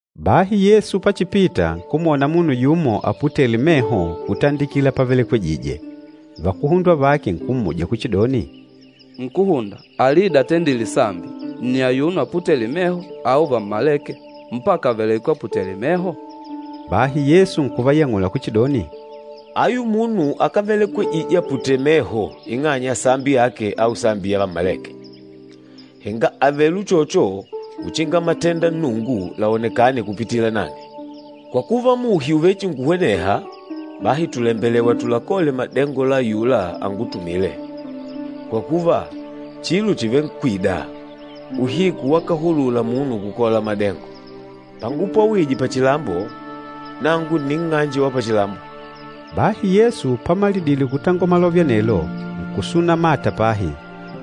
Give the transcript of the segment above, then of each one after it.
Bahi Yesu pachipita, nkumwona munu yumo aputêle meho kutandikila pavelekwejije. Vakuhundwa vake nkummuja kuchidoni, “Nkúhunda, alida atendîle sambi, nni ayuno aputêle meho au vammalêke, mpaka avelekwe aputèlè meho?” Bahi Yesu nkuvayang'ula kuchidoni, “Ayu munu akávelekwejije aputèlè meho ing'anya ya sambi yake au sambi ya vammalêke. Henga àvele uchocho uchinga matenda Nnungu laonekane kupitila nang'e. Kwa kuva, muhi ùvechinkuhweneha, bahi tùlembelewa tulakole madengo la ayula angutumîle, kwa kuva, chilo chìvenkwida, uhiku wakahulula munu kukola madengo. Pangupwawije pachilambo, nangu nni nng'anje wa pachilambo.” Bahi Yesu pamalidile kutangola malove anelo, nkusuna mata pahi,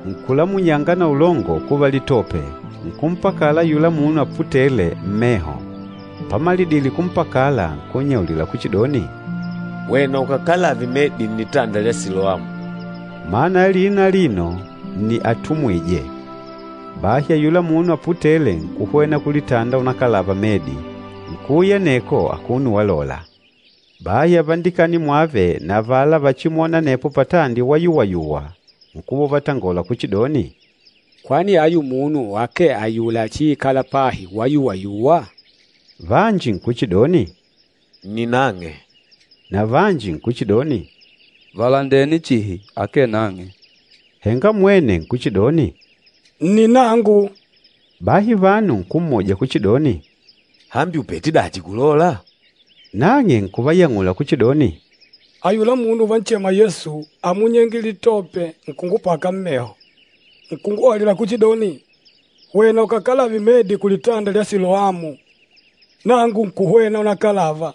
nkulamunyanga na ulongo kuva litope, nkumpakala ayula munu aputêle, mmeho. Pamalidile kumpakala, nkunnyaulila kuchidoni, “Hwena ukakalave medi nnitanda lya Siloamu,” mana ya lina alino ni “Atumwîje.” Bahi ayula munu aputêle, nkuhwena kulitanda unakalava medi, nkuuya aneko akuno walola. Bahi avandikani mwave na avala vachimwôna anepo patandi wayuwayuwa, nkuva uvatangola kuchidoni, “Kwani ayu munu akee ayula achiikâla pahi wayuwayuwa?” Vanji nkuchidoni, “Nni nang'e.” Na vanji nkuchidoni, “Valandene chihi akee nang'e.” Henga mwene nkuchidoni, “Nni nangu!” Bahi vanu nkummuja kuchidoni, “Hambi ùpete dachi kulola?” Nang'e nkuvayang'ula kuchidoni, “Ayula munu uvanchema Yesu, ámunyenge litope, nkungupaka mmeho, nkunguhaulila kuchidoni, ‘Hwena ukakalave medi kulitanda lya Siloamu.’ Nangu nkuhwena unakalava,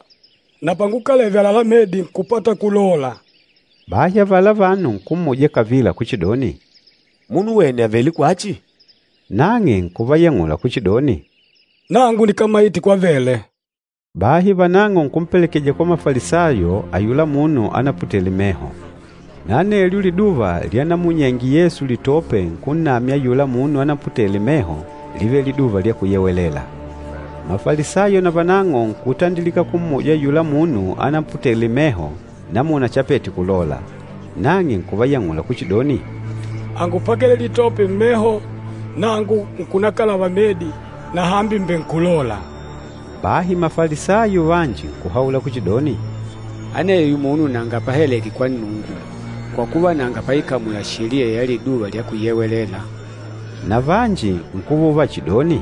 na pangukaleve àlalá medi, nkùpata kulola.” Bahi avala vanu nkummuja kavila kuchidoni, “Munu wene àvele kwachi?” Nang'e nkuvayang'ula kuchidoni, “Nangu nikámaite kwavele!” Bahi vanang'o nkumpelekeja kwa Mafalisayo ayula munu anaputele meho. Na anelyo liduva lyanamunyenge Yesu litope nkunnamya ayula munu anaputele meho, lívele Liduva lya Kuyewelela. Mafalisayo navanang'o nkutandilika kummuja ayula munu anaputele meho namuna chapete kulola. Nang'e nkuvayang'ula kuchidoni, “Ángupakele litope mmeho, nangu nkunakalava medi, na hambi mbènkulola.” Bahi Mafalisayo vanji nkuhaula kuchidoni, “Aneyo munu nanga pahalèkè kwa Nnungu, kwa kuva, nanga paikamula sheliya ya Liduva lya Kuyewelela.” Na vanji nkuva uvachidoni,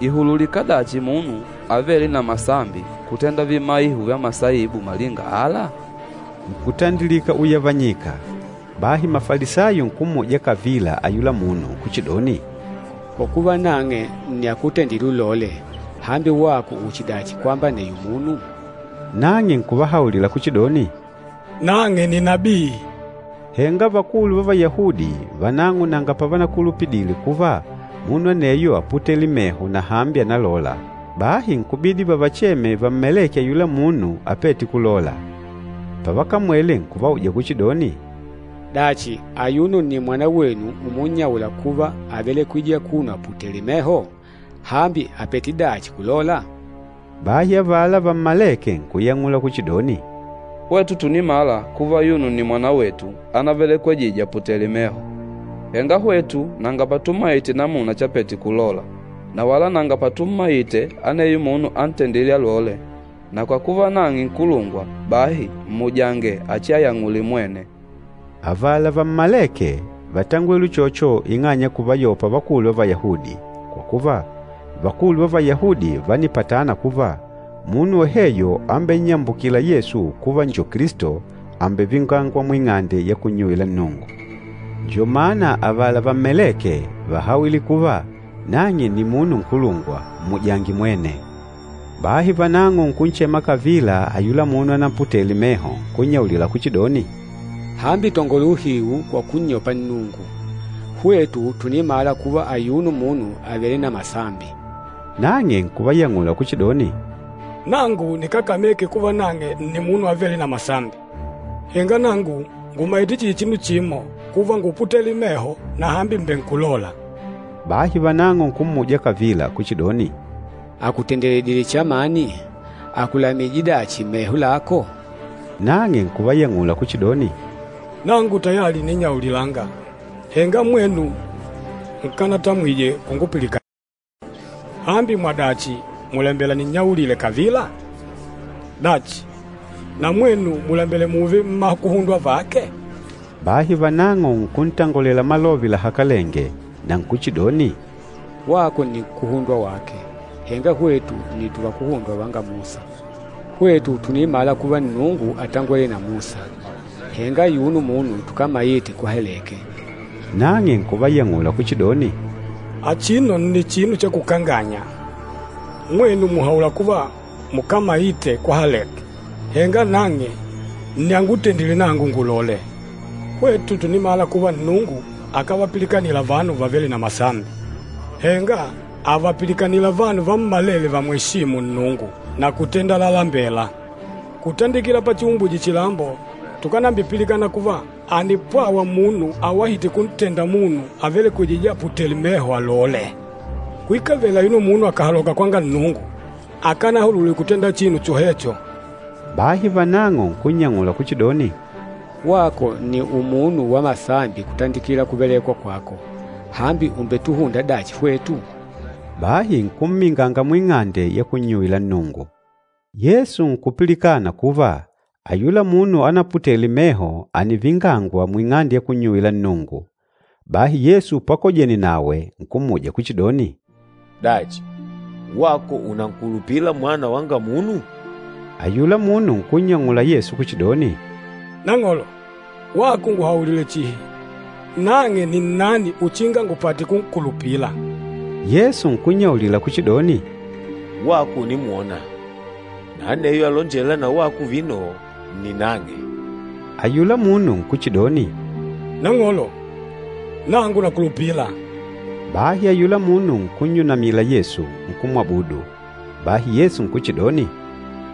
“Ìhululika dachi munu avêle na masambi kutenda vimaiho vya masaibu malinga ala?” Nkutandilika uyavanyika. Bahi Mafalisayo nkummuja kavila ayula munu kuchidoni, “Kwa kuva nang'e nni akutendîle ulole, hambi wako uchidachi kwamba aneyo munu?” Nang'e nkuvahaulila kuchidoni, “Nang'e ni nabii!” Henga vakulu va Vayahudi vanang'o nanga pavanakulupidile kuva munu aneyo áputele meho na hambi ànalola, bahi nkubidi vavacheme vammalêke ayula munu apête kulola. Pavakamwele, nkuvauja kuchidoni, “Dachi, ayuno nni mwanawenu umunnyaula kuva ávelekwejije akuno aputèlè meho? Hambi, àpete dachi kulola?” Bahi avala vammalêke nkuyang'ula kuchidoni, “Hwetu tùnimala kuva ayuno nni mwanawetu anavelekwejije aputèlè meho. Henga hwetu nanga patumaite namuna chapete kulola, na wala nanga patummaite aneyo munu antendîle alole. Na kwa kuva nang'e nkulungwa, bahi mmujange achiayang'ule mwene.” Avala vammalêke, vátangwele uchocho ing'anya ya kuvayopa vakulu va Vayahudi, kwa kuva, vakulu va Vayahudi vánipatana kuva, munu woheyo ambennyambukîla Yesu kuva njo Kilisto, àmbevingangwa muing'ande ya kunnyuwila Nnungu. Njo mana avala vammalêke, vàhawile kuva, “Nang'e nni munu nkulungwa, mmujange mwene.” Bahi vanang'o nkunchema kavila ayula munu anaputele meho, nkunnyaulila kuchidoni, “Hambi tangola uhiu kwa kunnyopa Nnungu. Hwetu tùnimala kuva ayuno munu àvele na masambi.” Nang'e nkuvayang'ula kuchidoni, “Nangu nikákameke kuva nang'e nni munu avêle na masambi. Henga nangu ngùmaite chihi chinu chimo, kuva ngúputele meho, na hambi mbènkulola.” Bahi vanang'o nkummuja kavila kuchidoni, “Àkutendeledile chamani? Àkulamije dachi meho lako?” Nang'e nkuvayang'ula kuchidoni, “Nangu tayali ǹninnyaulilanga, henga mwenu nkanatamwije kungupilikanila. Hambi mwadachi mùlembela ninnyaulile kavila? Dachi, na mwenu mùlembela mùùve mmakuhundwa vake?” Bahi vanang'o nkuntangolela malove lahakalenge na nkuchidoni, “Wako nni nkuhundwa wake, henga hwetu nni tuvakuhundwa vanga Musa! Hwetu tùnimala kuva Nnungu átangwele na Musa, henga ayuno munu tukámaite kwahaleke!” Nang'e nkuvayang'ula kuchidoni, “Achino nni chinu cha kukanganya! Mwenu mùhaula kuva mukámaite kwahaleke, henga nang'e nni angutendîle nangu ngulole! Hwetu tùnimala kuva Nnungu akávapilikanila vanu vavêle na masambi, henga àvapilikanila vanu vammalele vamweshîmu Nnungu na kutenda lalalembela. Kutandikila pachiumbwije chilambo tukánambipilikana kuva, ànipwawa munu awahîte kuntenda munu avelekwejîje aputèlè meho, alole. Kwikavele ayuno munu akàhaloka kwanga Nnungu, akanahulule kutenda chinu chohecho!” Bahi vanang'o nkunnyang'ula kuchidoni, “Wako nni umunu wa masambi kutandikila kuvelekwa kwako, hambi ùmbetuhunda dachi hwetu?” Bahi nkumminganga muing'ande ya kunnyuwila Nnungu. Yesu nkupilikana kuva ayula munu anaputele meho ànivingangwa muing'ande ya kunnyuwila Nnungu. Bahi Yesu pakojene nawe nkummuja kuchidoni, “Dachi, wako ùnankulupila Mwana wanga Munu?” Ayula munu nkunnyang'ula Yesu kuchidoni, “Nang'olo, wako nguhaulile chihi, nang'e ni nnani uchinga ngupate kunkulupila.” Yesu nkunnyaulila kuchidoni, “Wako ùnimwona, na aneyo alonjêla na wako vino nni nang'e.” Ayula munu nkuchidoni, “Nang'olo, nangu nakulupila!” Bahi ayula munu nkunnyunamila Yesu, nkumwabudu. Bahi Yesu nkuchidoni,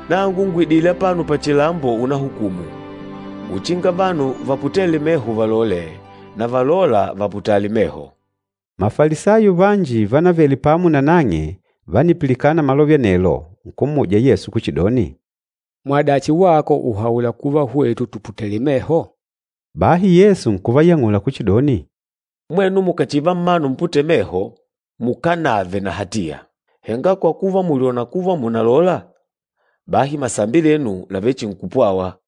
“Nangu ngùidile apano pachilambo unahukumu, uchinga vanu vaputêle meho valole, na valôla vaputale meho.” Mafalisayo vanji vánavele pamo na nang'e vánipilikana malove anelo, nkummuja Yesu kuchidoni, “Mwadachi wako ùhaula kuva hwetu tùputele meho?” Bahi Yesu nkuvayang'ula kuchidoni, “Mwenu mukàchiva mmanu muputêle meho, mukánave na hatiya. Henga kwa kuva mùlyona kuva mùnalola, bahi masambi lenu làvechinkupwawa.”